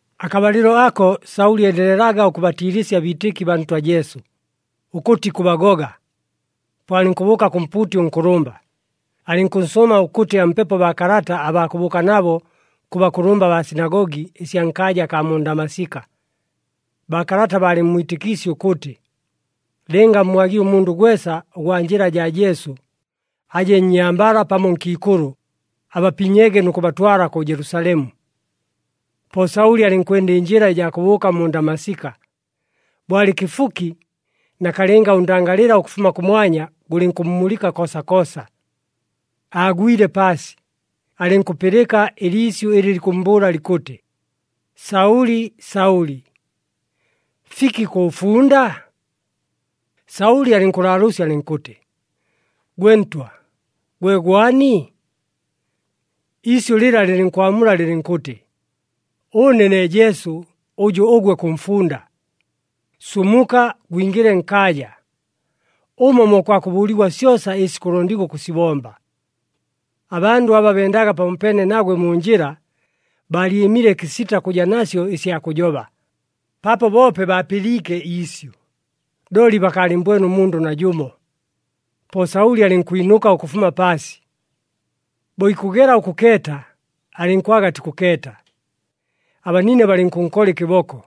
Akabalɨlo ako, Saʉli endelelaga ʉkʉbatiilɨsya abiitɨki baa Ntwa Jesu, ʉkʉtɨ ikʉbagoga. Po alɨnkʉbʉʉka kʉ mpuuti ʉnkʉlʉmba, alɨnkʉnsʉʉma ʉkʉtɨ ampepo baakalata abaa kʉbʉʉka nabo kʉ bakʉlʉmba baa sinagogi ɨsya nkaaja akaa mu Ndamasika. Baakalata baalɨmmwitɨkiisye ʉkʉtɨ, lɨnga ammwagile ʉmundʉ gwesa ʉgwa Njɨla jaa Jesu, aje nnyambala pamo nkiikʉlʉ, abapinyege nʉ kʉbatwala kʉ Jelusalemu. Po Saʉli alɨnkwenda ɨnjɨla ɨjaa kʉbʉʉka mu Ndamasika. Bo alɨ kɨfuki, nakalɨnga ʉndangalɨla ʉkʉfuma kʉmwanya gʉlɨnkʉmmulɨka koosakoosa. Aagwile paasi, alɨnkʉpɨlɨka ɨliisyʉ ɨlɨ likʉmmbʉʉla likʉtɨ, “Saʉli! Saʉli! Fiki kʉʉfunda?” Saʉli alɨnkʉlaalʉʉsya alɨnkʉtɨ, “Gwe Ntwa, gwe gwani?” Iisyʉ lɨla lɨlɨnkwamula lɨlɨnkʉtɨ, “Ʉne ne Jesu, ʉjʉ ʉgwe kʉmfunda. Sumuka! Gwingɨle nkaaja, ʉmo mo kwakʉbʉʉligwa syosa ɨsi kʉlondigwa ʉkʉsibomba.” Abandʉ aba bendaga pamopeene nagwe mu njɨla, baalyɨmile kɨsita kʉja nasyo ɨsya kʉjoba, paapo boope baapɨliike iisyʉ, looli bakaalɨmmbwene ʉmundʉ najʉmo. Po Saʉli alɨnkwinʉka ʉkʉfuma paasi. Bo ikʉgela ʉkʉkeeta, alɨnkwaga atikʉkeeta. Abanine balɨnkʉnkola ɨkɨboko,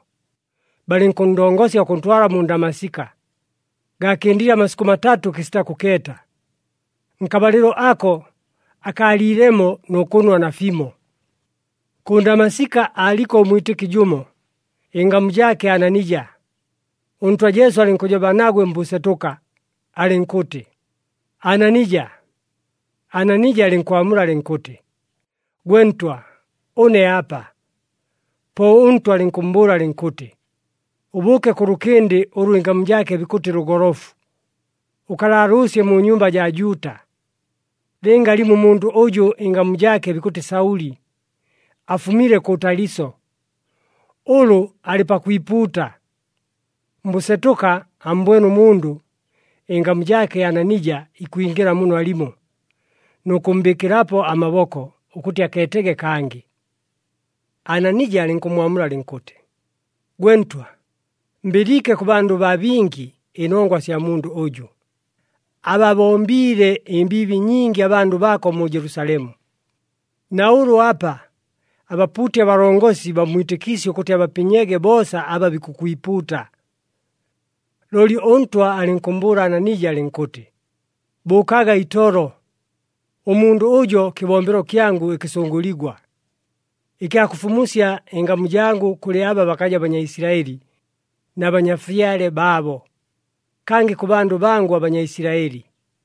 balɨnkʉnndongosya ʉkʉntwala mu Ndamasika. Gaakɨndile amasikʉ matatʉ kɨsita kʉkeeta. Nkabalɨlo ako akaaliilemo nʉ kʉnwa nafimo. Kʉ Ndamasika aaliko ʉmwitɨki jʉmo, ɨngamu jaake Ananija. ɄNtwa Jesu alɨnkʉjoba nagwe mbʉsetʉka, alɨnkʉtɨ, “Ananija!” Ananija alɨnkwamula alɨnkʉtɨ, “Gwe Ntwa, ʉne apa.” Po ʉNtwa alɨnkʉmmbʉʉla alɨnkʉtɨ, “Ʉbʉʉke kʉ lʉkɨndɨ ʉlʉ ɨngamu jaake bikʉtɨ Lʉgolofu. Ʉkalaalʉʉsye mu nyumba jaa Juuta, lɨnga alimo ʉmundʉ ʉjʉ ɨngamu jaake bikʉtɨ Saʉli, afumile kʉ Taliso. Ʉlʉ alɨ pakwipuuta. Mbʉsetʉka ammbwene ʉmundʉ, ɨngamu jaake Ananija, ikwingɨla muno alimo nʉ kʉmmbɨɨkɨlapo amaboko, ʉkʉtɨ akeetege kangɨ.” Ananija alɨnkʉmmwamula alɨnkʉtɨ, “Gwe Ntwa, mbɨliike kʉ bandʉ baa bingi, ɨnongwa sya mundʉ ʉjʉ, ababombiile ɨmbiibi nyingi abandʉ baako mu Jelusalemu! Na ʉlʉ apa, abapuuti abalongosi bammwitɨkiisye ʉkʉtɨ abapinyege boosa aba bikʉkwipuuta.” Looli ʉNtwa alɨnkʉmmbʉʉla Ananija alɨnkʉtɨ, “Bʉʉkaga itolo! Ʉmundʉ ʉjo, kɨbombelo kyangʉ ɨkɨsʉngʉligwa, ɨkya kʉfumusya ɨngamu jangʉ kʉlɨ aba bakaja Banyaisilaɨli na banyafyale baabo, kangɨ kʉ bandʉ bangʉ aBanyaisilaɨli.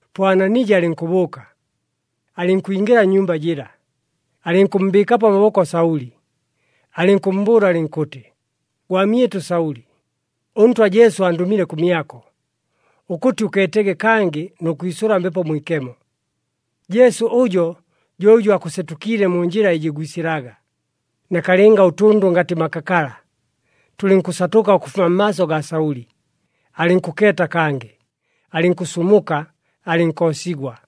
Po Ananija alɨnkʉbʉʉka, alɨnkwingɨla nnyumba jɨla, alɨnkʉmmbɨɨkapo amaboko Saʉli, alɨnkʉmmbʉʉla alɨnkʉtɨ, “Gwamyɨtʉ Saʉli, ʉNtwa Jesu andʉmile kʉmyako, ʉkʉtɨ ʉkeetege kangɨ nʉ kwisʉla Mbepo Mwikemo. Jesu ʉjo jo ʉjʉ aakʉsetʉkiile mu njɨla ɨjɨ gwisɨlaga.” Nakalɨnga ʉtʉndʉ ngatɨ makakala, tʉlɨnkʉsatʉka ʉkʉfuma mmaaso gaa Saʉli, alɨnkʉkeeta kangɨ, alɨnkʉsumuka, alɨnkoosigwa.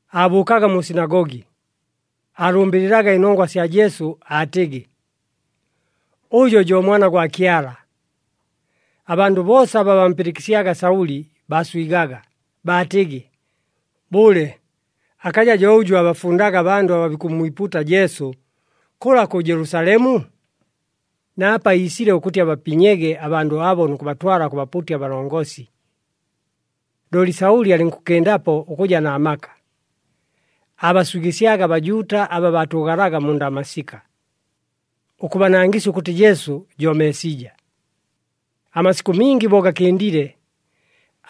Aabʉʉkaga mu sinagogi, aalʉmbɨlɨlaga ɨnongwa sya Jesu aatɨgɨ, “Ʉjo jo Mwana gwa Kyala.” Abandʉ boosa aba bampɨlɨkɨsyaga Saʉli baaswigaga, baatɨgɨ, “Bʉle, akaja jo ʉjʉ aabafundaga abandʉ aba bikʉmmwipuuta Jesu, kʉla kʉ Jelusalemu? Na apa iisile ʉkʉtɨ abapinyege abandʉ abo nʉ kʉbatwala kʉ bapuuti abalongosi!” Looli Saʉli alɨnkʉkɨndapo ʉkʉja na maka, aabaswigɨsyaga aBajuuta aba baatʉʉgalaga mu Ndamasika, ʉkʉbanangɨsya ʉkʉtɨ Jesu jo Meesija. Amasikʉ mingi bo gakɨndile,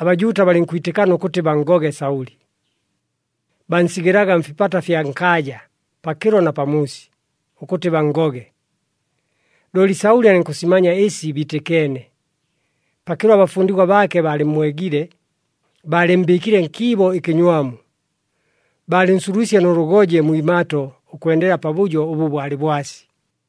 aBajuuta balɨnkwitɨkana ʉkʉtɨ banngoge Saʉli. Bansigɨlaga mfipata fya nkaaja, pakɨlo na pamuusi, ʉkʉtɨ banngoge. Looli Saʉli alɨnkʉsimanya ɨsi biitɨkeene. Pakɨlo abafundigwa baake baalɨmmwegile, baalɨmmbɨɨkile nkiibo ɨkɨnywamu, baalɨnsulwisye nʉ lʉgoje mwi imato ʉkwendela pabʉjo ʉbʉ bwalɨ bwasi.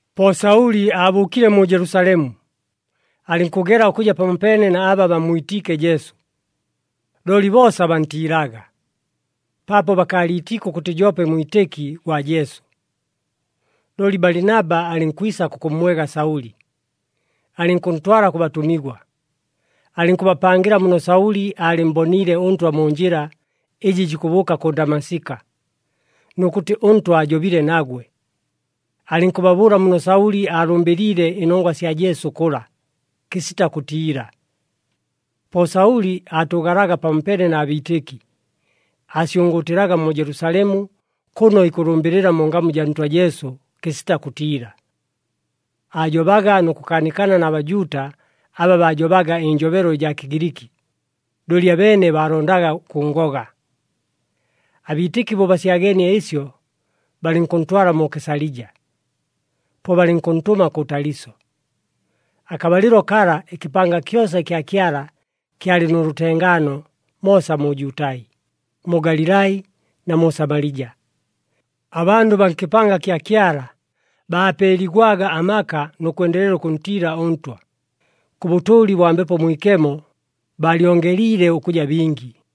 Po Saʉli aabʉʉkile mu Jelusalemu, alɨnkʉgela ʉkʉja pamopeene na aba bammwitiike Jesu. Looli boosa bantiilaga, paapo bakaaliitiike ʉkʉtɨ joope mwitɨki gwa Jesu. Looli Balinaba alɨnkwisa kʉkʉmmwega Saʉli, alɨnkʉntwala kʉ batʉmigwa. Alɨnkʉbapangɨla muno Saʉli aalɨmmboniile ʉNtwa mu njɨla ɨjɨ jikʉbʉʉka kʉ Ndamasika, nʉ kʉtɨ ʉNtwa aajobile nagwe. Alɨnkʉbabʉʉla muno Saʉli aalʉmbɨlɨliile ɨnongwa sya Jesu kʉla, kɨsita kʉtiila. Po Saʉli aatʉʉgalaga pamopeene na biitɨki, aasyʉngʉʉtɨlaga mu Jelusalemu kʉno ikʉlʉmbɨlɨla mu ngamu jaa Ntwa Jesu, kɨsita kʉtiila. Aajobaga nʉ kʉkaanikana na Bajuuta aba baajobaga ɨnjobelo ɨjaa Kɨgiliki, looli abeene baalondaga ʉkʉnngoga. Abiitɨki bo basyageenie ɨsyo, balɨnkʉntwala mu Kesalija, po balɨnkʉntʉma kʉ Taliso. Akabalɨlo kala, ɨkɨpanga kyosa ɨkya Kyala kyalɨ nʉ lʉtengaano moosa mu Jutai, mu Galilai na mu Samalija. Abandʉ baa nkɨpanga kya Kyala baapeeligwaga amaka nʉ kwendelela ʉkʉntiila ʉNtwa. Kʉ bʉtʉʉli bwa Mbepo Mwikemo, baalyongeliile ʉkʉja bingi.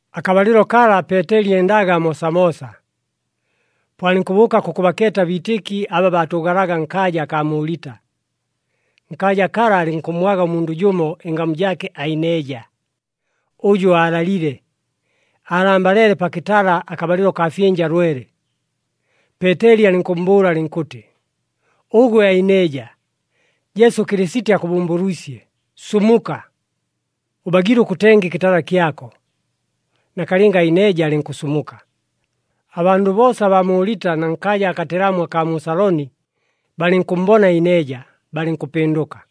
Akabalɨlo kala Peeteli endaga moosamoosa. Po alɨnkʉbʉʉka kʉkʉbakeeta abiitɨki aba baatʉʉgalaga nkaaja akaa mu Lita. Nkaaja kala alɨnkʉmmwaga ʉmundʉ jʉmo ɨngamu jaake Aineja, ʉjʉ aalalile. Aalambaleele pa kɨtala akabalɨlo kaa fyɨnja lwele. Peeteli alɨnkʉmmbʉʉla alɨnkʉtɨ, “Ʉgwe Aineja, Jesu Kɨlɨsiti akʉbʉmbʉlwisye. Sumuka! Ʉbagiile ʉkʉtenga ɨkɨtala kyako.” Nakalɨnga Aineja alɨnkʉsumuka. Abandʉ boosa abaa mu Lita na nkaaja akatelamu akaa mu Saloni, balɨnkʉmmbona Aineja, balɨnkʉpɨndʉka.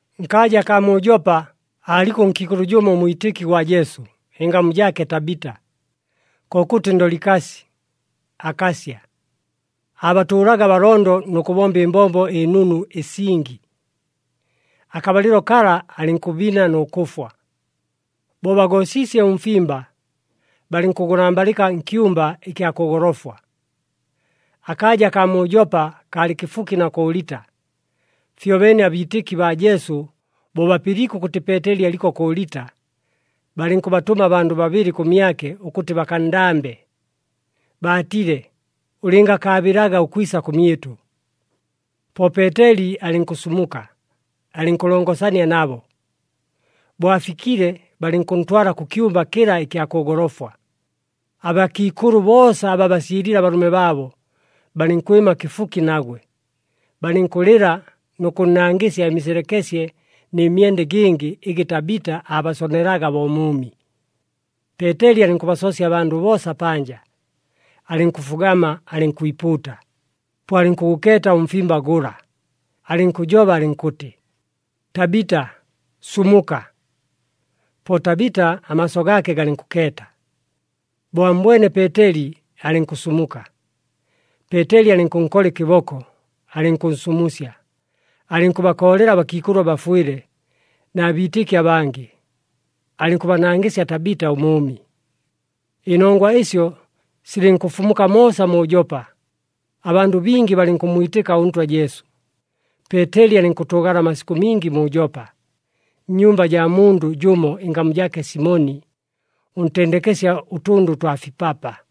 Nkaaja akaa mu Jopa aaliko ʉnkiikʉlʉ jʉmo ʉmwitɨki gwa Jesu, ɨngamu jaake Tabita, kokʉtɨ Ndolikasi, akasya. Aabatʉʉlaga abalondo nʉ kʉbomba ɨmbombo ɨnunu ɨsingi. Akabalɨlo kala, alɨnkʉbina nʉ kʉfwa. Bo bagoosiisye ʉmfimba, balɨnkʉgʉlambalɨka nkyumba ɨkya kʉ golofwa. Akaaja kaa mu Jopa kaalɨ kɨfuki na kʉ Lita. Fyobeene abiitɨki baa Jesu bo bapɨliike ʉkʉtɨ Peeteli aliko kʉ Lita, balɨnkʉbatʉma abandʉ babɨlɨ kʉmyake ʉkʉtɨ bakanndambe. Baatile, “Ʉlɨngakaabɨlaga ʉkwisa kʉmyɨtʉ!” Po Peeteli alɨnkʉsumuka, alɨnkʉlongosania nabo. Bo afikile, balɨnkʉntwala kʉ kyumba kɨla ɨkya kʉ golofwa. Abakiikʉlʉ boosa aba baasyɨlile abalʉme baabo, balɨnkwɨma kɨfuki nagwe. Balɨnkʉlɨla nʉ kʉnnangɨsya ɨmiselekesye nɨ myenda ɨgɨngɨ ɨgɨ Tabita aabasonelaga bo mʉʉmi. Peeteli alɨnkʉbasoosya abandʉ boosa panja. Alɨnkʉfugama alɨnkwipuuta, po alɨnkʉgʉkeeta ʉmfimba gʉla, alɨnkʉjoba alɨnkʉtɨ, “Tabita, sumuka!” Po Tabita amaaso gaake galɨnkʉkeeta. Bo ammbwene Peeteli alɨnkʉsumuka. Peeteli alɨnkʉnkola ɨkɨboko, alɨnkʉnsumusya, alɨnkʉbakoolela abakiikʉlʉ abafwɨle na biitɨki abangɨ, alɨnkʉbanangɨsya Tabita ʉmʉʉmi. Ɨnongwa ɨsyo silɨnkʉfumuka moosa mu Jopa, abandʉ bingi balɨnkʉmmwitɨka ʉNtwa Jesu. Peeteli alɨnkʉtʉʉgala amasikʉ mingi mu Jopa, nnyumba jaa mundʉ jʉmo ɨngamu jaake Simoni, ʉntendekesya ʉtʉndʉ twa fipapa.